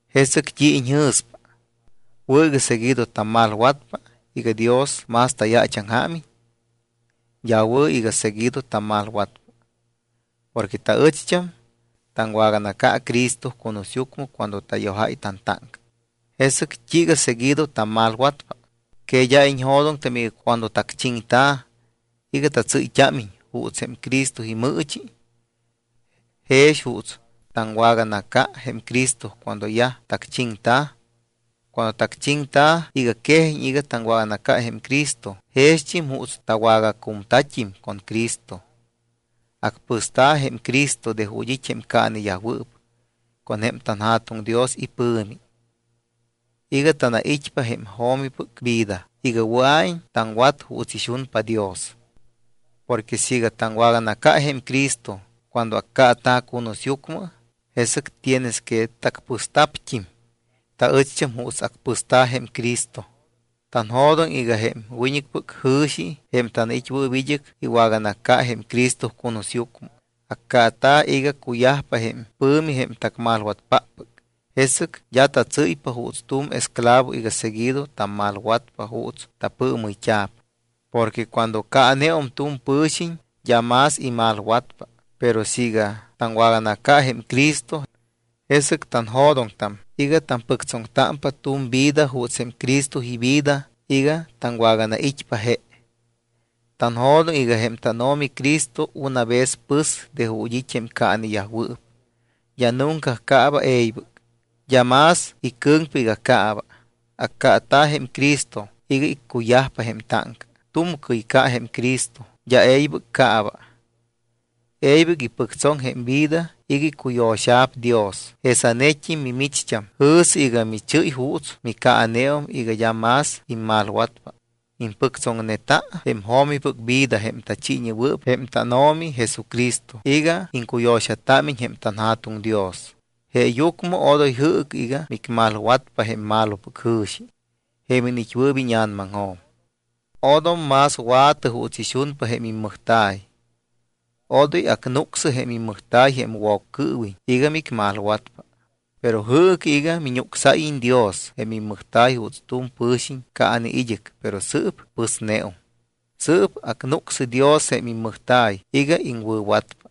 ¿Jesɨc t́i iñjɨ̱spa, wɨ̱ iga seguido tammalwatpa iga Dios más tayaachaŋjaamiñ? D́a wɨ̱ iga seguido tammalwatpa. Porque taɨcht́am taŋwaganaca Cristo cunusyucmɨ cuando tayojáy tantáŋca. ¿Jesɨc t́iiga seguido tammalwatpa? ¿Que d́a iñjo̱doŋtam iga cuando tacchiŋta̱ iga tatsɨ́yt́ámiñ juuts jém Cristo imɨɨchi, jex juuts taŋwaganaca jém Cristo cuando yaj tacchiŋta̱? Cuando tacchiŋta̱ iga quejiñ iga taŋwaganaca jém Cristo, jext́im juuts tawagacumta̱t́im con Cristo. Acpɨsta̱ jém Cristo de ju̱t́ it́ jém caaneyajwɨɨp con jém tanJa̱tuŋ Dios ipɨ̱mi iga tanait́pa jém jo̱mipɨc vida iga wɨa̱iñ taŋwat juuts ixunpa Dios. Porque siiga taŋwaganaca jém Cristo cuando accaata̱ cunusyucmɨ, jesɨc tienes que tacpɨsta̱pt́im taɨcht́am juuts acpɨsta̱ jém Cristo. Tanjo̱doŋ iga jém wiñɨcpɨc jɨ̱xi, jém tanait́wɨɨp id́ɨc, iwaganaca jém Cristo cunusyucmɨ. Accaata̱ iga cuyajpa jém pɨ̱mi jém tacmalwatpáppɨc, jesɨc d́a tatsɨ́ypa juuts tu̱m esclavo iga seguido tammalwatpa juuts tapɨɨmɨyt́a̱p. Porque cuando caaneum tu̱m pɨ̱xiñ, d́a más imalwatpa. Pero siiga taŋwaganaca jém Cristo, jesɨc tanjo̱doŋtam iga tampɨctsoŋtámpa tu̱m vida juuts jém Cristo ivida iga taŋwaganait́pa je. Tanjo̱doŋ iga jém tánO̱mi Cristo una vez pɨs de ju̱t́ it́ jém caaneyajwɨɨp, d́a nunca caaba e̱ybɨc. D́a más icɨ̱ŋpa iga caaba. Accaata̱ jém Cristo iga iccuyajpa jém táŋca. Tu̱mcɨy ca jém Cristo, d́a e̱ybɨc caaba. E̱ybɨc ipɨctsoŋ jém vida iga icuyo̱xa̱p Dios. Jesanet́im, mimicht́am, jɨ̱sɨ iga michɨ́y juuts micaaneum iga d́a más immalwatpa. Impɨctsoŋneta jém jo̱mipɨc vida jém tachiiñewɨɨp jém tánO̱mi Jesucristo iga iŋcuyo̱xatámiñ jém tanJa̱tuŋ Dios. Jeeyucmɨ odoy jɨɨcɨ iga micmalwatpa jém malopɨc jɨ̱xi, jém iniit́wɨɨp íña̱namaŋjo̱m. Odom más wa̱tɨ juuts ixunpa jém immɨjta̱y. Odoy acnúcsɨ jém immɨjta̱y jém Woccɨɨwiñ iga micmalwatpa. Pero jɨɨcɨ iga miñúcsáyiñ Dios jém immɨjta̱y juuts tu̱m pɨ̱xiñ caane id́ɨc, pero sɨɨp pɨsneum. Sɨɨp acnúcsɨ Dios jém immɨjta̱y iga iŋwɨ̱watpa.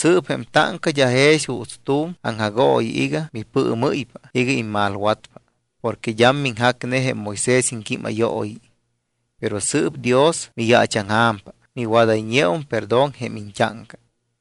Sɨɨp jém táŋca d́a jex juuts tu̱m aŋjagooyi iga mipɨɨmɨ́ypa iga immalwatpa. Porque d́am miŋjacne jém Moisés iŋquímayooyi. Pero sɨɨp Dios miyaachaŋja̱mpa, miwadayñeum perdón jém iñt́áŋca.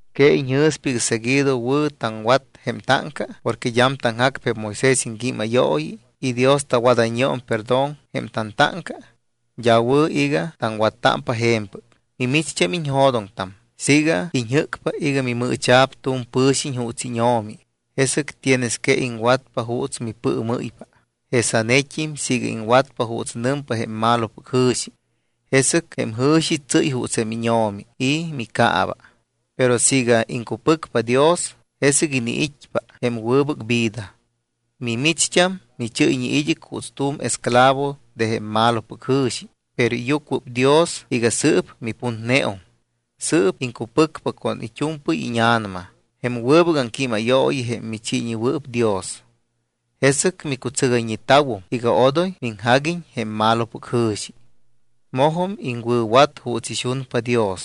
¿Que iñjɨ̱spa iga seguido wɨ̱ taŋwat jém táŋca porque d́am taŋjacpa jém Moisés iŋquímayooyi y Dios tawadayñeum perdón jém tantáŋca? D́a wɨ̱ iga taŋwattámpa je̱mpɨc. Micht́am iñjo̱doŋtam siiga iñjɨ́cpa iga mimɨɨcha̱p tu̱m pɨ̱xiñ juuts íño̱mi, jesɨc tienes que iŋwatpa juuts mipɨɨmɨ́ypa. Jesanet́im siiga iŋwatpa juuts nɨmpa jém malopɨc jɨ̱xi, jesɨc jém jɨ̱xi tsɨ́y juuts jém íño̱mi y miccaaba. Pero siiga iŋcupɨcpa Dios, jesɨc iniit́pa jém wɨbɨc vida. Mimicht́am michɨ́yñe id́ɨc juuts tu̱m esclavo de jém malopɨc jɨ̱xi, pero iyucuɨpdios iga sɨɨp miputneum. Sɨɨp iŋcupɨcpa con it́u̱mpɨy íña̱nama jém wɨbɨc aŋquímayooyi jém michiiñewɨɨp Dios. Jesɨc micutsɨgayñeta̱wum iga odoy miŋjaguiñ jém malopɨc jɨ̱xi. Mojum iŋwɨ̱wat juuts ixunpa Dios.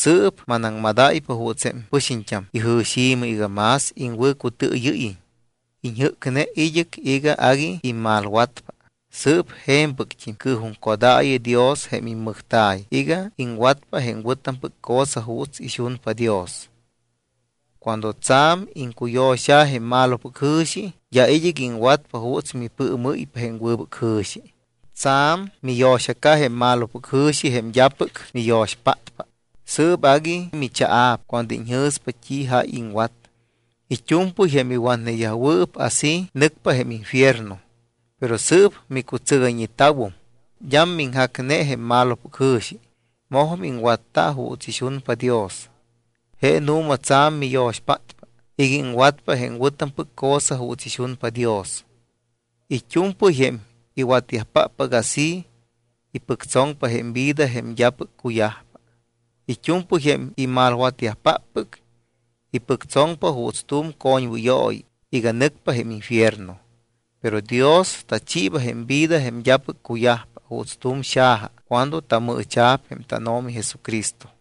Sɨɨp manaŋmadáypa juuts jém pɨxiñt́am ijɨ̱xi̱mɨ iga más iŋwɨ̱cutɨɨyɨ́yiñ. Iñjɨ́cne id́ɨc iga agui immalwatpa. Sɨɨp je̱mpɨct́im cɨɨjuŋcodaayɨ Dios jém immɨjta̱y iga iŋwatpa jém wɨ̱tampɨc cosa juuts ixunpa Dios. Cuando tsa̱m iŋcuyo̱xa̱ jém malopɨc jɨ̱xi, d́a id́ɨc iŋwatpa juuts mipɨɨmɨ́ypa jém wɨbɨc jɨ̱xi. Tsa̱m miyo̱xaca jém malopɨc jɨ̱xi jém d́apɨc miyo̱xpátpa. Sɨɨp agui michaa̱p cuando iñjɨ̱spa t́i jáy iŋwat. It́u̱mpɨy jém iwatneyajwɨɨp así nɨcpa jém infierno. Pero sɨɨp micutsɨgayñeta̱wum. D́am miŋjacne jém malopɨc jɨ̱xi. Mojum iŋwatta juuts ixunpa Dios. Je nu̱ma tsa̱m miyo̱xpátpa iga iŋwatpa jém wɨ̱tampɨc cosa juuts ixunpa Dios. It́u̱mpɨy jém iwatyajpáppɨc así, ipɨctsoŋpa jém vida jém d́apɨc cuyajpa. It́u̱mpɨy jém imalwatyajpáppɨc ipɨctsoŋpa juuts tu̱m coñwɨyooyi iga nɨcpa jém infierno. Pero Dios tachiiba jém vida jém d́apɨc cuyajpa juuts tu̱m xaja cuando tamɨɨcha̱p jém tánO̱mi Jesucristo.